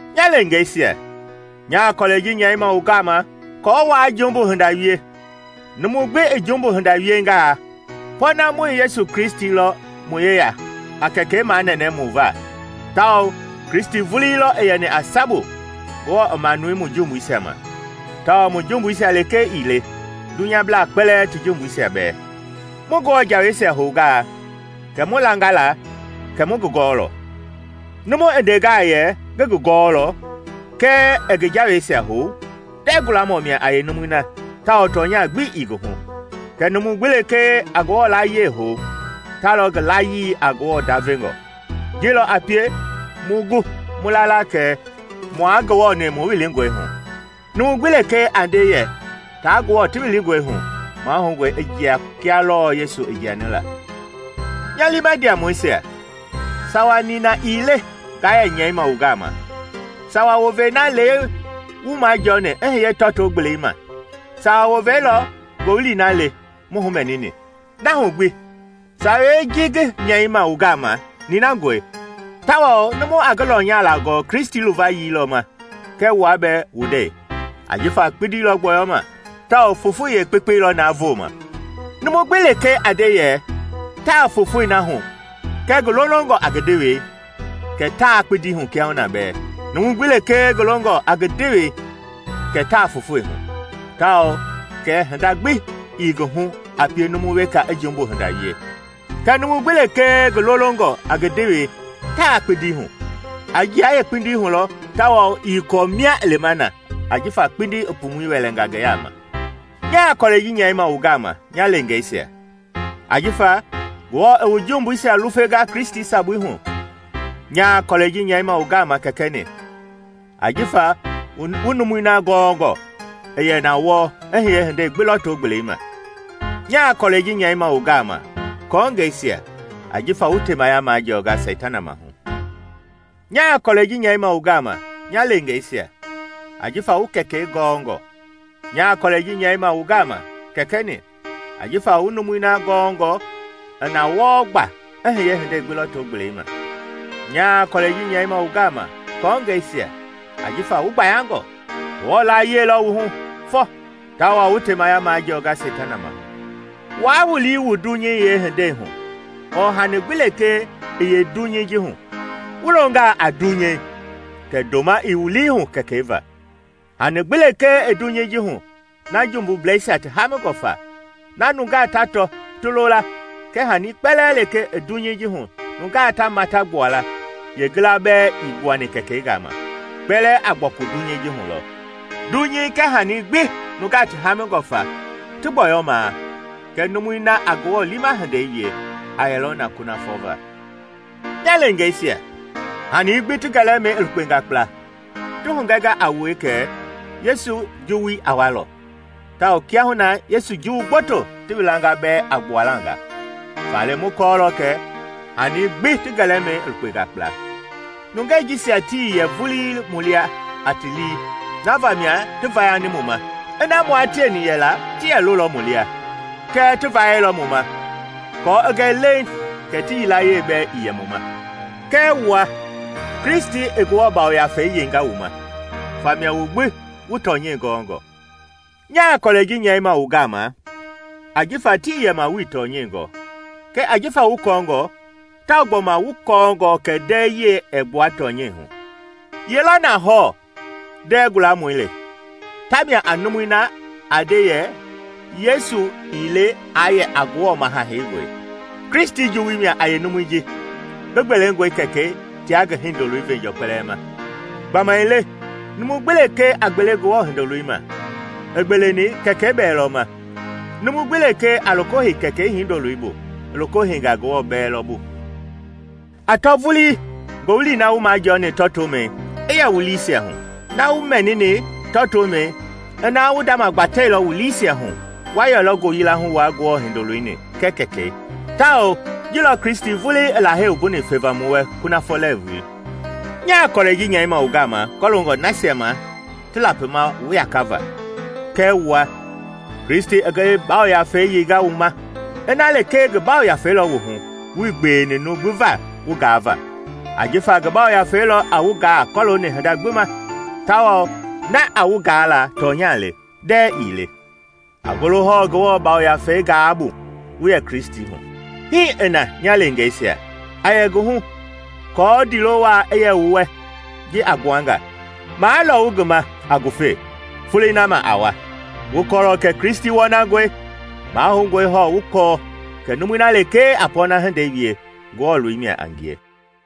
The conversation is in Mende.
Nya leengeisia, nyaa kɔlɛi ji nyɛima wu gama aako waa jumbu hinda wie; numu gbi i jumbu hinda wiengaa, pɔɔnamɔi Yesu Kristi lɔ mu yeya a Kɛkɛi manɛnɛ mu va. Tawao Kristi vulii lɔ i yɛni a sabu Ngewɔ i manuni mu jumbuisia ma, tawao mu jumbuisia lekee ii le, dunyablaa kpɛlɛɛ ti jumbuisia bɛɛ. Mu Ngewɔ jaweisia houngaa kɛ mu langa la kɛ mu ngi gɔɔlɔ. Numu i ndengaa yɛ, “Ngi ngi gɔɔlɔ,” kɛɛ ɛɛ ngi jaweisia hou, ndɛɛ gualamɔ mia a yeenumui na tawao tɔnyagbi ii ngi hu. Kɛɛ numu gbi lekee a Ngewɔ laayiɛi hou, ta lɔ ngi layii a Ngewɔ ndavengɔ. Ji lɔ a pie mu gu mu la la kɛ mua Ngewɔ-ni mu wilingɔe hu: numu gbi lekee a nde yɛ taa Ngewɔ ti wilingɔe hu, mahoungɔi i jia kia lɔɔ Yesu i jiani la. Nya liima ndiamɔisia, sawa nina ii le ngaa yɛ nyɛima wu gama; sawa wovei na le wu majɔɔni i hiye tɔto-gbelei ma. Sawa wovei lɔ ngowili na le mu humɛnini. Na hu gbi, sawei ji ngi nyɛima wu gama ninangɔe, tawao numu a ngi lɔnyala gɔɔ Kristi luvayii lɔ ma kɛɛ wua bɛɛ wu ndɛi. Ajifa kpindi lɔ gbɔyɔma, tawao fofoi yeekpekpei lɔ na vooma. Numu gbi lekee a nde yɛ taa fofoi na hu kɛɛ ngi lolongɔ a ngi ndewei, kɛ taa kpindi hu kiahuna bɛɛ. Numu gbi lekee ngi longɔ a ngi ndewei kɛ taa fofoi hu, tawao kɛ hinda gbi ii ngi hu a pie numu weka i jumbu hinda wie. Kɛɛ numu gbi lekee ngi lolongɔ a ngi ndewei, taa kpindi hu; a jia yeekpindii hu lɔ tawao ii kɔɔ mia i lima na ajifa kpindi i pumui wɛlɛnga ngi yaama. Nyaa kɔlɛi ji nyɛima wu gama, nya leengeisia, ajifa Ngewɔ i wu jumbuisia lufenga Kristi sabui hu. Nyaa kɔlɛi ji nyɛima wu gama, kɛkɛ-ni, ajifa wu numui na gɔɔngɔ i yɛ na wɔɔ i hiye hindei gbi lɔto-gbelei ma. Nyaa kɔlɛi ji nyɛima wu gama, kɔɔngɛisia, ajifa wu temaya majɔɔnga Seitana maahu. Nyaa kɔlɛi ji nyɛima wu gama, nya leengeisia, ajifa wu Kɛkɛi gɔɔngɔ. Nyaa kɔlɛi ji nyɛima wu gama, kɛkɛ-ni, ajifa wu numui na gɔɔngɔ i na wɔɔ gba i hiye hindei gbi lɔto-gbelei ma. Nyaa kɔlɛi ji nyɛima wu gama, kɔɔngɛisia, ajifa wu gbayangɔ; Ngewɔ laayiɛi lɔ wu hu fɔ tawao wu temaya majɔɔnga Seitana maahu. Waa wu lii wu dunyei yeehindei hu ɔɔ hanii gbi lekee i yeedunyei ji hu. Wu longaa a dunyei, kɛ ndoma ii wu lii hu Kɛkɛi va. Hanii gbi lekee i dunyei ji hu na jumbubleisia ti haamingɔ fa, na nungaa ta tɔ ti lo la kɛɛ hanii kpɛlɛɛ lekee i dunyei ji hu nungaa ta mata gbua la, yeengila bɛɛ ii gbuani Kɛkɛi gama, kpɛlɛɛ a gbɔku dunyei ji hu lɔ. Dunyei kɛɛ hanii gbi nungaa ti hamingɔ fa ti gbɔyɔmaa; kɛɛ numui na a Ngewɔ liima hindei wie a yɛlɔ na kunafɔ va. Nya leengeisia, hanii gbi ti gɛlɛmɛi i lukpenga kpla. Ti hugɛnga a wue kɛ Yesu juwui a walɔ; tawao kiahuna na Yesu juwu gboto ti wilanga bɛɛ a gbuala nga, faale mu kɔɔlɔ kɛ hanii gbi ti gɛlɛmɛi i lukpenga kpla. Nungɛi jisia tii yɛ vulii mu lia a ti lii, na vamia ti vayani mu ma; kiaa mua tieni yɛla ti yɛ lolɔ mu lia. Kɛɛ ti vayɛilɔ mu ma aako i gɛ leiŋ kɛ ti yilayee bɛɛ ii yɛ mu ma. Kɛɛ wua, Kristi i Ngewɔ Yafei yeinga wu ma, famia wu gbi wu tɔnyɛi gɔɔngɔ. Nyaa kɔlɛi ji nyɛima wu gama ajifa tii yɛma wuii tɔnyɛi gɔɔ, kɛɛ jifa wu kɔɔngɔ, tawao gbɔma wu kɔɔngɔ kɛ ndɛɛ yiɛi ɛɛ gbua tɔnyɛi hu. Ye lɔ na hɔɔ ndɛɛ gualamɔi le? Tamia a numui na a nde yɛ Yesu ii le aa yɛ a Ngewɔ Maha Heingɔi. Kristi juwui mia a yeenumui ji ngi gbelengɔe Kɛkɛi tia ngi Hindoloi veenjɔɔ kpɛlɛɛ ma. Gbamaile numu gbi lekee a gbele Ngewɔ Hindoloi ma, i gbeeleni Kɛkɛi bɛɛ lɔ ma; numu gbi lekee a loko hei Kɛkɛi Hindoloi bu, i loko heinga Ngewɔ bɛɛ lɔ bu. A tɔ vulii ngowili na wu majɔɔni tɔtomɛi i yɛ wu liisia hu. Na wu mɛnini tɔtomɛi ina wu ndama gbatɛilɔ wu liisia hu wa yɛlɔ ngoyila hu wua Ngewɔ Hindoloi-ni kɛɛ Kɛkɛi. Tawao ji lɔ Kristi vulii i Lahei wumbuni feva mu wɛ kunafɔ lɛɛvui. Nyaa kɔlɛi ji nyɛima wu gama kɔloongɔ nasia ma ti lapima wu yakava. Kɛɛ wua, Kristi i ngi Yafei yeinga wu ma. Ina lekee ngi Yafei lɔ wu hu, wuii gbeweni numu gbi va wu gaava. Ajifa ngi Yafei lɔ a wu gaa kɔlooni hinda gbi ma, tawao na a wu gaa la tɔnya le, ndɛɛ ii le. A golo hɔɔ Ngewɔ Yafei gaai bu, wu yɛ Kristi hu. Hii i na, nya leengeisia, a yɛ ngi hu, aako ndiilo waa i yɛ mu wɛ ji a gbuanga, maa lɔwu ngi ma a ngufe folei na ma a wa. Wu kɔɔlɔ kɛ Kristi wɔnangɔe; mahoungɔe hɔɔ wu kɔɔ kɛ numui na lekee a pɔɔna hindei wie Ngewɔ loi mia a ngie.